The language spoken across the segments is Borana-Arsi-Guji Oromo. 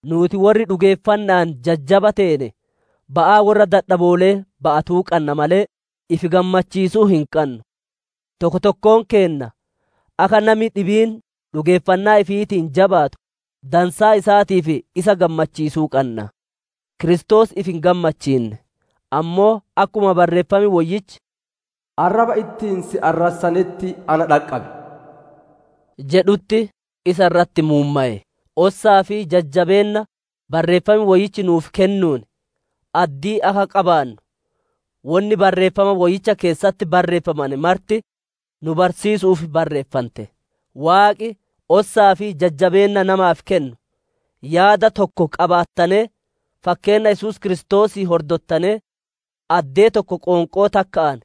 Nuuti worri dhugeeffanna'aan jajjaba teene, ba'aa worra dadhaboole'ee ba'atuu qanna malee, ifi gammachiisuu hin qannu. Tokko tokkoon keenna akka nami dhibiin dhugeeffannaa ifiitiin jabaatu, dansaa isaatiif isa gammachiisuu qanna. Kiristoos ifi hin gammachiinne; ammoo, akkuma Barreeffam Woyyichi, «Arraba ittiin si arrassanetti na dhaqqabe» jedhutti isa irratti muummowe. Ossaa fi jajjabeenna Barreeffam Woyyichi nuuf kennuun addii akka qabaannu, wonni Barreeffama Woyyicha keessatti barreeffamane marti nu barsiisu'uuf barreeffante. Waaqi, ossaa fi jajjabeenna namaaf kennu, yaada tokko qabaattanee, fakkeenna Yesuus Kiristoosii hordottanee, addee tokko qoonqoo takka'aan,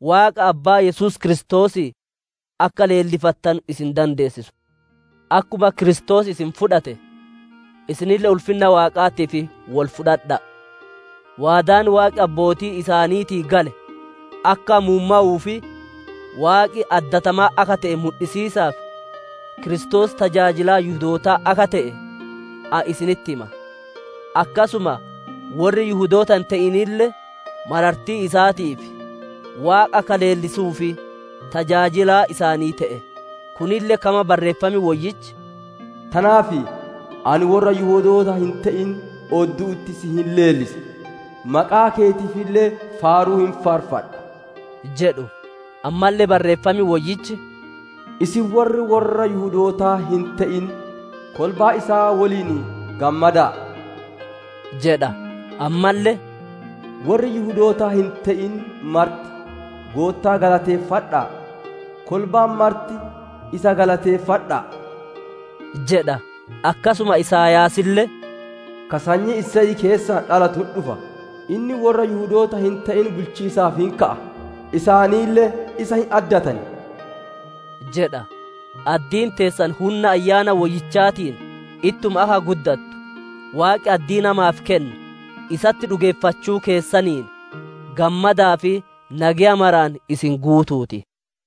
Waaqa Abbaa Yesuus Kiristoosii akka leellifattanu isin dandeessisu. Akkuma Kiristoos isin fudhate, isinille ulfinna Waaqaatiif wol fudhadha'a. Waadaan Waaqi abbootii isaaniitii gale akka muummowuu fi Waaqi addatamaa akka te'e mudhisiisaaf, Kiristoos tajaajilaa Yihudootaa akka te'e, ani isinitti hima. Akkasuma worri Yihudoota hin te'inille marartii isaatiif, Waaqa akka leellisuuf tajaajilaa isaanii te'e; kunille kama Barreeffam Woyyichi, «Tanaaf ani worra Yihudoota hin te'in oddu'utti si hin leellisa; maqaa keetiifille faaruu hin faarfadha» jedhu. Ammalle Barreeffam Woyyichi, «Isin worri worra Yihudootaa hin te'in, kolbaa isaa woliin gammada'a» jedha. Ammalle, «Worri Yihudoota hin te'in marti, Goottaa galateeffadha'a; kolbaan marti, isa galateeffadha'a!» jedha. Akkasuma Isaayaasille, «Ka sanyii Iseyii keessaa dhalatu hin dhufa; inni worra Yihudoota hin te'in bulchiisaaf hin ka'a; isaanille isa hin addatan» jedha. Addiin teessan hunna Ayyaana Woyyichaatiin ittuma akka guddattu, Waaqi addii namaaf kennu, isatti dhugeeffachuu keessaniin, gammadaa fi nageya maraan isin guutuu ti.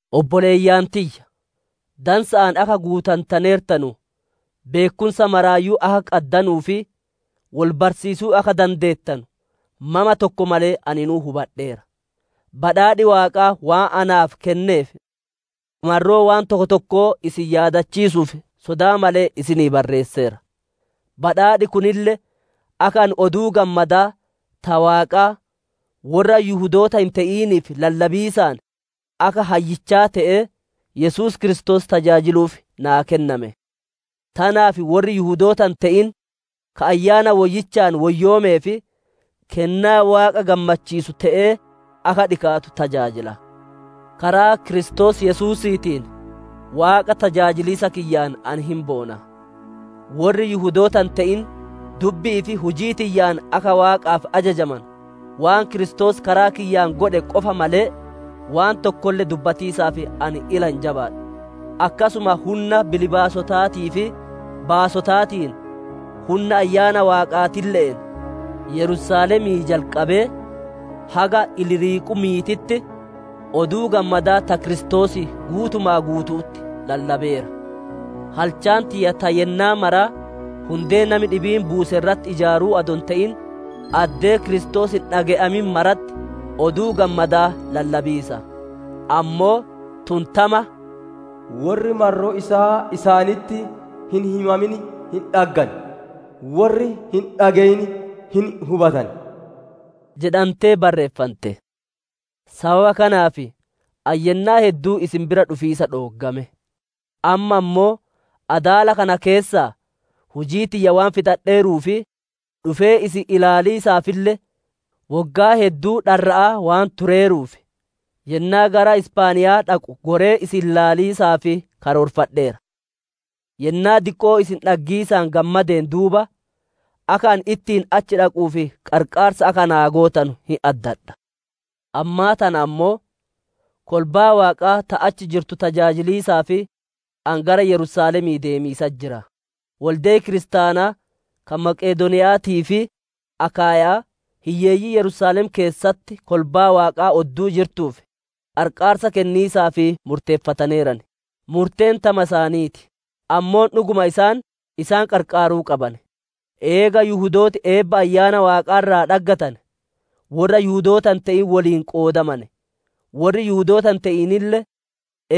Obboleeyyan tiyya! Dansa'aan akka guutantaneertanu, beekkumsa maraayyuu akka qaddanuu fi wol barsiisuu akka dandeettanu, mama tokko malee aninuu hubadheera. Badhaadhi Waaqaa waan naaf kenneef, marroo waan tokko tokkoo isin yaadachiisu'uuf sodaa malee isinii barreesseera. Badhaadhi kunille, akka ani Oduu Gammadaa, ta Waaqaa, worra Yihudoota hin te'iniif lallabiisaan akka hayyichaa te'ee, Yesuus Kiristoos tajaajiluuf naa kenname. Tanaaf worri Yihudoota hin te'in ka Ayyaana Woyyichaan woyyoomee fi kennaa Waaqa gammachiisu te'ee akka dhikaatu tajaajila. Karaa Kiristoos Yesuusiitiin Waaqa tajaajiliisa kiyyaan ani hin boona. Worri Yihudoota hin te'in dubbi'ii fi hujii tiyyaan akka Waaqaaf ajajamanu, waan Kiristoos karaa kiyyaan godhe qofa malee waan tokkolle dubbatiisaaf ani ila hin jabaadhu. Akkasuma hunna bilbaasotaatii fi baasotaatiin, hunna Ayyaana Waaqaatille'een, Yerusaalemii jalqabee haga Iliiriqumiititti, Oduu Gammadaa ta Kiristoosii guutuma guutu'utti lallabeera. Halchaan tiyya ta yennaa maraa hundee nami dhibiin buuse irratti ijaaruu adoo hin te'in, addee Kiristoos hin dhage'amin maratti Oduu Gammadaa lallabiisa. Ammoo, tun tama, «Worri marroo isaa isaanitti hin himamin hin dhaggan; worri hin dhage'in hin hubatan» jedhantee barreeffante. Sababa kanaaf ani yennaa hedduu isin bira dhufiisa dhooggame. Amma ammoo adaala kana keessaa hujii tiyya waan fixadheeruu fi dhufee isin ilaaliisaafille woggaa hedduu dharra'aa waan tureeruuf, yennaa gara Isphaaniyaa dhaqu goree isin ilaaliisaaf karoorfadheera. Yennaa diqqoo isin dhaggiisaan gammadeen duuba, akka ani ittiin achi dhaquuf qarqaarsa akka naa gootanu hin addadha. Ammaa tana ammoo, kolbaa Waaqaa ta achi jirtu tajaajiliisaaf ani gara Yerusaalemii deemiisatti jira. Wolde'i kiristaanaa ka Maqedooniya'aatii fi Akaayya'aa, hiyyeeyyii Yerusaalem keessatti kolbaa Waaqaa odduu jirtuuf, qarqaarsa kenniisaaf murteeffataneeran. Murteen tama isaanii ti; ammoo dhuguma isaan, isaan qarqaaruu qaban; eega Yihudooti eebba Ayyaana Waaqaa irraa dhaggatane worra Yihudoota hin te'in woliin qoodamane, worri Yihudoota hin te'inille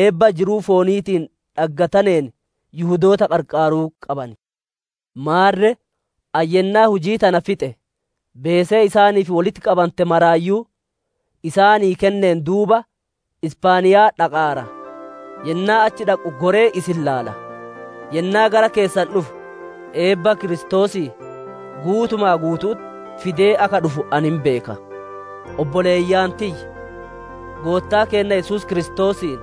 eebba jiruu fooniitiin dhaggataneen Yihudoota qarqaaruu qaban. Maarre, ani yennaa hujii tana fixe, beesee isaaniif wolitti qabante maraayyuu isaanii kenneen duuba, Isphaaniyaa dhaqaara; yennaa achi dhaqu goree isin ilaala. Yennaa gara keessan dhufu, eebbaa Kiristoosii guutumaa guutu'utti fidee akka dhufu ani hin beeka. Obboleeyyan tiyya! Goottaa keenna Yesuus Kiristoosiin,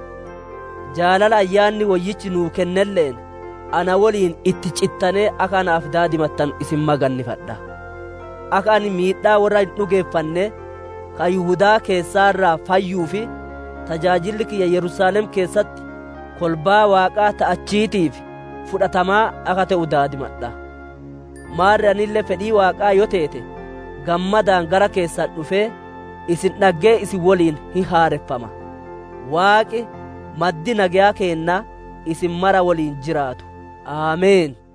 jaalala Ayyaanni Woyyichi nuu kennelle'een, na woliin itti cittanee akka naaf daadimattanu isin magannifadha. Akka ani miidhaa worra hin dhugeeffannee, ka Yihudaa keessaa irraa fayyuu fi tajaajilli kiyya Yerusaalem keessatti kolbaa Waaqaa ta achiitiif fudhatamaa akka te'u daadimadha'a. Maarre anille fedhii Waaqaa yoo teete, gammadaan gara keessan dhufee, isin dhaggee isin woliin hin haareffama. Waaqi, maddi nageya keennaa, isin mara woliin jiraatu. Ameen.